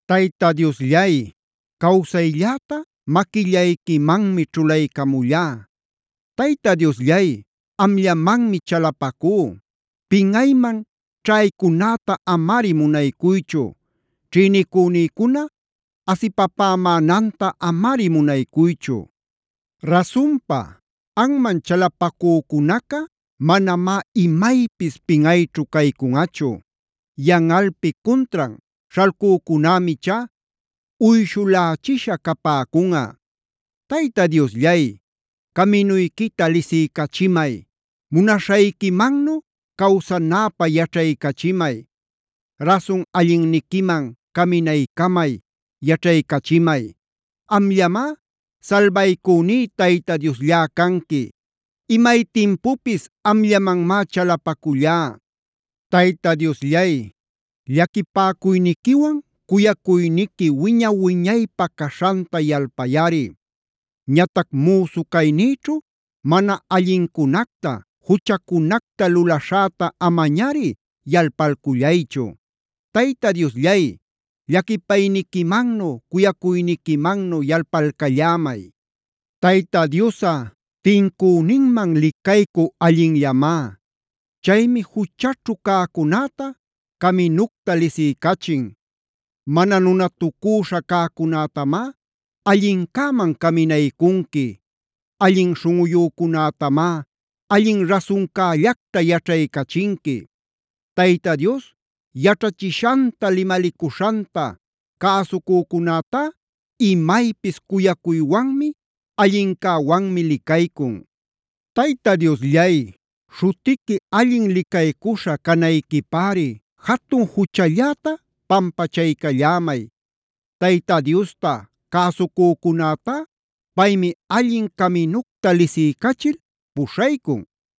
Tayta Diosllay, cawsaylläta maquillayquimanmi ćhulaycamullá. Tayta Diosllay, amllamanmi chalapacú: Pinꞌayman ćhaycunäta amari munaycuychu, ćhïnicünïcuna asipapämänanta amari munaychu. Rasunpa, anman chalapacücunaca manamá imaypis pinꞌayćhu caycunꞌachu. Yanꞌalpi cuntran śhalcücunämi ichá uyshulächisha capäcunꞌa. Tayta Diosllay, caminuyquita lisiycachimay. Munaśhayquimannu cawsanäpä yaćhaycachimay. Rasun allinniquiman caminaycamay, yaćhaycachimay. Amllamá salbaycüní Tayta Diosllá canqui. Imay timpupis amllamanmá chalapacullá. Tayta Diosllay, llaquipäcuyniquiwan cuyacuyniqui wiña-wiñaypä caśhanta yalpayꞌari. Ñatac müsu caynïćhu mana allincunacta, juchacunacta lulaśhäta amañari yalpalcullaychu. Tayta Diosllay, llaquipayniquimannu, cuyacuyniquimannu yalpalcallämay. Tayta Diosꞌa tincüninman licaycü allinllamá. Chaymi juchaćhu cäcunäta caminucta lisiycachin. Mana nunatucüśha cäcunätamá allincäman caminaycunqui. Allin śhunꞌuyücunätamá allin rasuncällacta yaćhaycachinqui. Tayta Dios yaćhachishanta, limalicuśhanta cäsucücunätá imaypis cuyacuywanmi, allincäwanmi licaycun. Tayta Diosllay, śhutiqui allin licaycuśha canayquipäri jatun juchalläta pampachaycallämay. Tayta Diosta cäsucücunätá, paymi allin caminucta lisiycachil puśhaycun.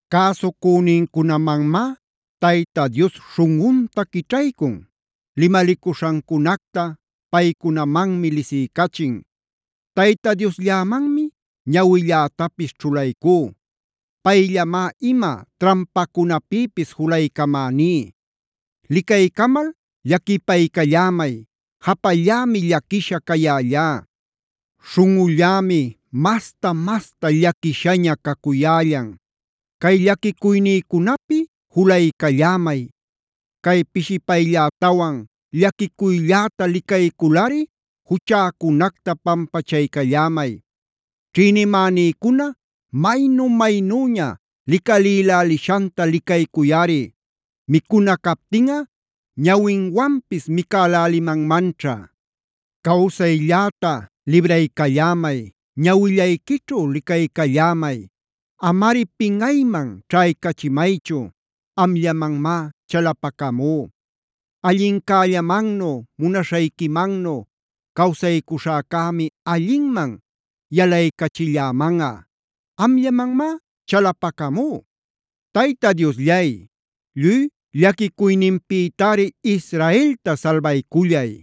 Cäsucünincunamanmá Tayta Dios śhunꞌunta quićhaycun. Limalicuśhancunacta paycunamanmi lisiycachin. Tayta Diosllämanmi ñawillätapis ćhulaycú. Payllamá ima trampacunapïpis julaycamäní. Licaycamal llaquipaycallämay. Japallämi llaquisha cayällá. Śhunꞌullämi masta-masta llaquishaña cacuyällan. Cay llaquicuynïcunapi julaycallämay. Cay pishipayllätawan llaquicuylläta licayculꞌari juchäcunacta pampachaycallämay. Ćhïnimänïcuna maynu-maynüña licalïlälishanta licaycuyꞌari. Micuna captinꞌa ñawinwanpis micälälimanmanćha. Cawsaylläta libraycallämay, ñawillayquićhu licaycallämay. Amari pinꞌayman ćhaycachimaychu. Amllamanmá chalapacamú. Allincällamannu, munaśhayquimannu cawsaycuśhäcämi allinman yalaycachillämanꞌa. Amllamanmá chalapacamú. Tayta Diosllay, lluy llaquicuyninpïtari Israelta salbaycullay.